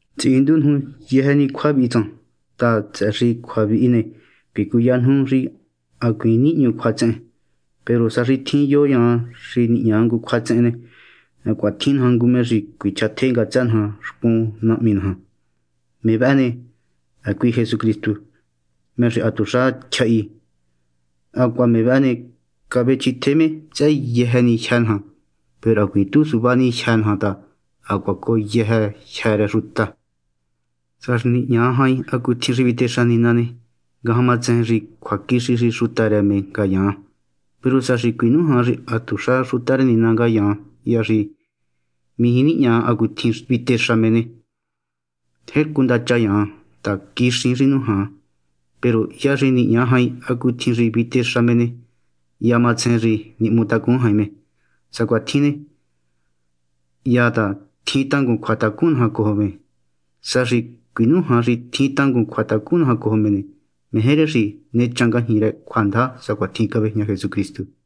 Titsihindu nuju yëjë ni cjua vihi tsan ta, tsëhë xi cjua vihi ne, cuicuya nuju xi hacuiin nihñu cjuatsehen. Peru sa xi tjin yo yaan xi nihña ngu cjuatsehen ne, hacuaha tjin naja ngu me xi cuichjatje ngatsë naja xcun Nahmi naja. Me vëhë ne, hacui Jesucristu, me xi hatuxa tyjahi. Hacuaha me vëhë ne, cavechjitje me tsëhë yëjë ni jyë́ naja. Peru hacuiin tu suvá ni jyë́ naja ta hacuaha cojo jyë́ rë yëjë sa xuta. Sa xi nihña jain hacutjin xi vitexa Nina ne, ngajan matsejen xi cjuaquixi xi xuta rë me ngayaan. Peru sa xi cuinújan xi hatuxa xuta rë Nina ngayaan hya xi mijí nihña hacutjin vitexa me ne, tjercu ndacha yaan ta quixiin xi nújan. Peru hya xi nihña jain hacutjin xi vitexa me ne, hya matsejen xi nihmutacun jain me. Sa cuatjin ne, hyan ta tjin tangun cjuatacun naja cojo me. Sa xi cuinújan xi tjin tangun cjuatacun naja cojo me ne, meje rë xi nechan ngajñi rë cjuandaja sacuatjin cavejña Jesucristu.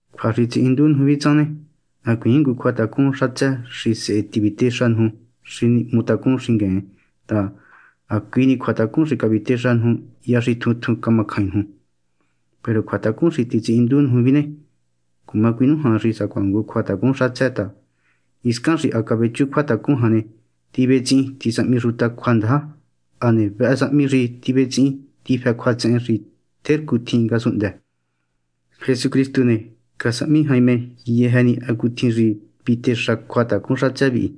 Cjua xi titsihindu nuju vihi tsan ne, hacuiin ngu cjuatacun xatsë xi sehe tivitéxa nuju xi nihmutacun xingueen ta, ha hacui ni cjuatacun xi cavitéxa nuju hya xi tjun tjun camacjain nuju. Peru cjuatacun xi titsihindu nuju vihi ne, cuma cuinújan xi sacuaha ngu cjuatacun xatsë ta, hiscan xi ha cavechu cjuatacun jan ne, tivetsihin tisahmi xuta cjuandaja. Hane vëhë sahmi xi tivetsihin tifë cjuatsehen xi tjercu tjin ngasunhndë. Jesucristu ne, casahmi jain me yëjë ni hacutjin xi vitexa cjuatacun xatsë vihi,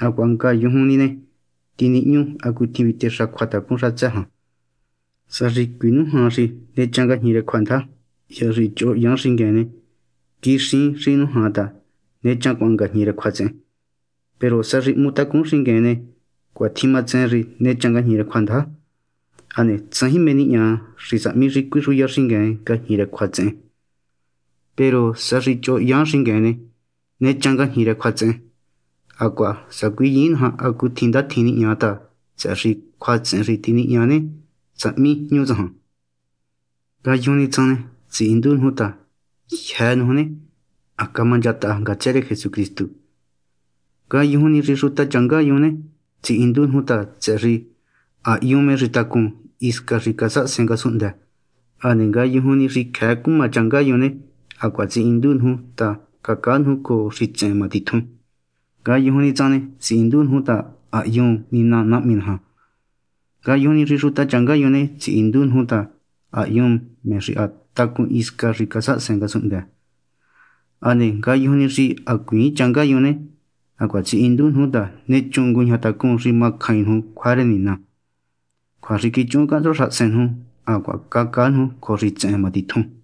hacuaha ngayujun ni ne, tinihñu hacutjin vitexa cjuatacun xatsë jan. Sa xi cuinújan xi nechan ngajñi rë cjuandaja, hya xi choho hyan xingueen ne, quixiin xi nújan ta nechancuaan ngajñi rë cjuatsehen. Peru sa xi hmutacun xingueen ne, cuatjin matsejen xi nechan ngajñi rë cjuandaja. Hane tsajin mé nihña xi sahmi xi cuixuya xingueen ngajñi rë cjuatsehen jan. Peru sa xi choho hyan xingueen ne, nechan ngajñi rë cjuatsehen, hacuaha sacuiyiin naja hacutjin ndatjin nihña ta tsëhë xi cjuatsehen xi tinihña ne, sahmi jñu tsajan. Ngayujun ni tsan ne, tsihindu nuju ta, jyë́ nuju ne, ha camanchataha ngatsë rë Jesucristu. Ngayujun ni xi xuta changá yun ne, tsihindu nuju ta, tsëhë xi ha hyun me xi ha tacun hisca xi casahasen ngasunhndë. Hane ngayujun ni xi cjëë cuma changá yun ne, hacuaha tsihindu nuju ta ha cacaa nuju cojo xitsehen má titjun. Ngayujun ni tsan ne, tsihindu nuju ta ha hyun Nina Nahmi naja. Ngayujun ni xi xuta changá yun ne, tsihindu nuju ta ha hyun me xi ha tacun hisca xi casahasen ngasunhndë. Hane ngayujun ni xi hacuiin changá yun ne, hacuaha tsihindu nuju ta nechun nguñajatacún xi macjain nuju cjua rë Nina, cjua xi quichuhun cahntsua xahasen nuju, hacuaha cacaa nuju cojo xitsehen ma titjun.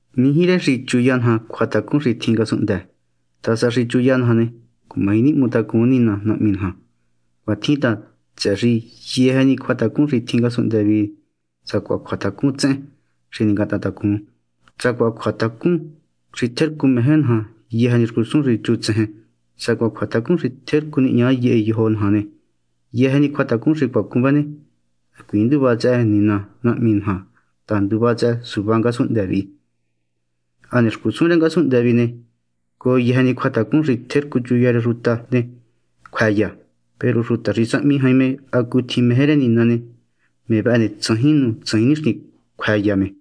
Mijí rë xi chuya naja cjuatacun xi tjin ngasunhndë ta, sa xi chuya naja ne, cumaji nihmutacun Nina Nahmi naja. Cuatjin ta, tsëhë xi yëjë ni cjuatacun xi tjin ngasunhndë vihi, sacuaha cjuatacun tsehen xi ningatahantacun, sacuaha cjuatacun xi tjercu meje naja yëjë ni xcusun xi chutsejen, sacuaha cjuatacun xi tjercu nihña yehe yojo naja ne, yëjë ni cjuatacun xi cuacun vëhë ne, hacuiin nduva tsëhë Nina Nahmi naja ta nduva tsëhë suvá ngasunhndë vihi. Hane xcusun rë ngasunhndë vihi ne, cojo yëjë ni cjuatacun xi tjercu chuya rë xuta ne, cjuëya. Peru xuta xi sahmi jain me hacutjin meje rë Nina ne, me vëhë ne, tsajin nu tsajin nixtin cjuëya me.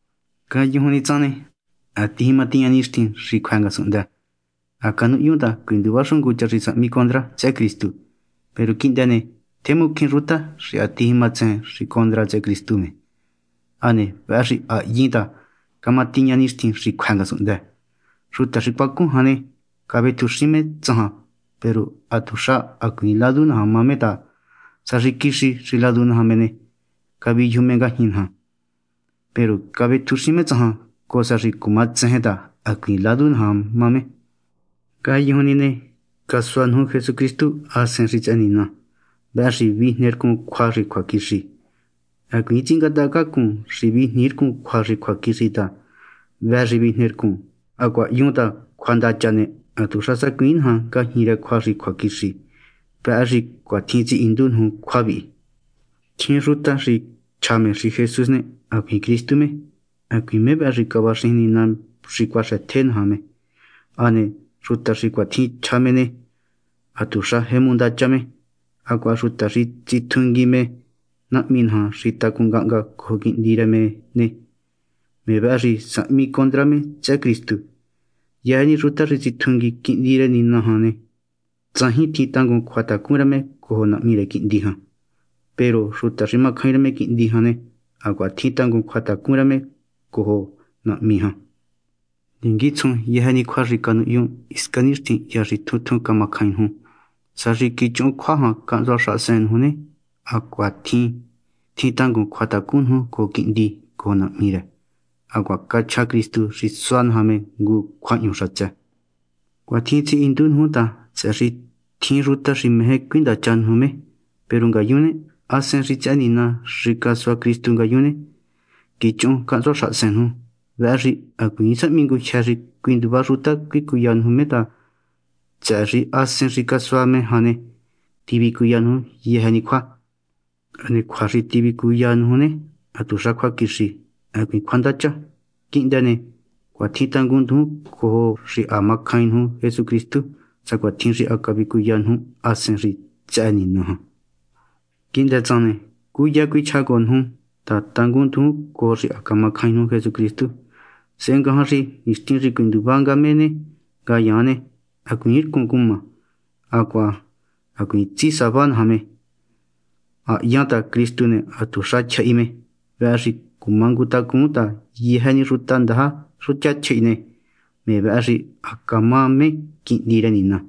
Ngayujun ni tsan ne, ha tijima tiña nixtin xi cjuë ngasunhndë. Ha canuhyun ta cuinduva xu ngu cha xi sahmi condra tsëhë Cristu. Peru quihndë ne, tjemu cjín xuta xi ha tijimatsejen xi condra tsëhë Cristu me. Hane vëhë xi ha hyin ta cama tiña nixtin xi cjuë ngasunhndë. Xuta xi cuacun jan ne, cavetjuxin me tsajan. Peru hatuxa hacuiin ladu naja me ta, sa xi quixi xi ladu naja me ne, caviyuju me ngajñi naja. Peru cavetjuxin me tsajan, cojo sa xi cuma tsejen ta hacuiin ladu naja me. Ngayujun ni ne, casua nuju Jesucristu Hasen xi tsëhë Nina. Vëhë xi vijnercun cjua xi cjuaquixi. Hacuiin tsingátahacacun xi vijniircun cjua xi cjuaquixi ta ha hvë xi vijnercun. Hacuaha hyun ta cjuandacha ne, hatuxa sacuiin naja ngajñi rë cjua xi cjuaquixi. Vëhë xi cuitjin tsihindu nuju cjua vihi. Tjin xuta xi chja xi Jesús ne, hacuiin Cristu me, hacuiin me xi cavaxijin Nina xi cuaxëtje naja. Hane xuta xi cuatjin chja me ne, hatuxa tjemu ndacha me. Hacuaha xuta xi tsitjungui me Nahmi naja xi tacun ngahnga cojo Quihndi rë ne, me vëhë xi sahmi condra tsëhë Cristu. Yëjë ni xuta xi tsitjungui Quihndi rë Nina jan ne, tsajin tjin tangun cjuatacun rë me cojo Nahmi rë Quihndi jan. Peru xuta xi macjain rë Quihndi jan ne, hacuaha tjin tangun cjuatacun rë me cojo Nahmi jan. Ninguitsjun yëjë ni cjua xi canuhyun hisca nixtin hya xi tjun tjun camacjain nuju. Sa xi quichuhun cjua jan cahntsua xahasen nuju ne, hacuatjin tjin tangun cjuatacun nuju cojo Quihndi cojo Nahmi rë. Hacuaha cachja Cristu xi sua naja me ngu cjuahñu xatsë. Cuitjin tsihindu nuju ta, tsëhë xi tjin xuta xi meje cuindacha nuju me. Peru ngayun ne, Hasen xi tsëhë Nina xi casua Cristu ngayun ne, quichuhun cahntsua xahasen nuju. Vëhë xi hacuiin sahmi ngujyë xi cuinduva xuta cuicuya nuju me ta, tsëhë xi Hasen xi casua me jan ne, tivicuya nuju yëjë ni cjua. Hane cjua xi tivicuya nuju ne, hatuxa cjuaquixi, hacuiin cjuandacha. Quihndë ne, cuatjin tangunndujun cojo xi ha macjain nuju Jesucristu, sacuatjin xi ha cavicuya nuju Hasen xi tsëhë Nina jan. Quihndë tsan ne, cúya cuichjá cojo nuju ta tangun nduju cojo xi ha macjain nuju Jesucristu, sehe ngajan xi nixtin xi cuinduva nga me ne, ngayaan ne, hacuiin rcun cuma, hacuaha hacuiin tsisava naja me. Ha hyan ta Cristu ne, hatuxa tyjahi me. Vëhë xi cumangutacun ta yëjë ni xuta ndaja xuta tyjahi ne, me vëhë xi ha camá me quihndi rë Nina.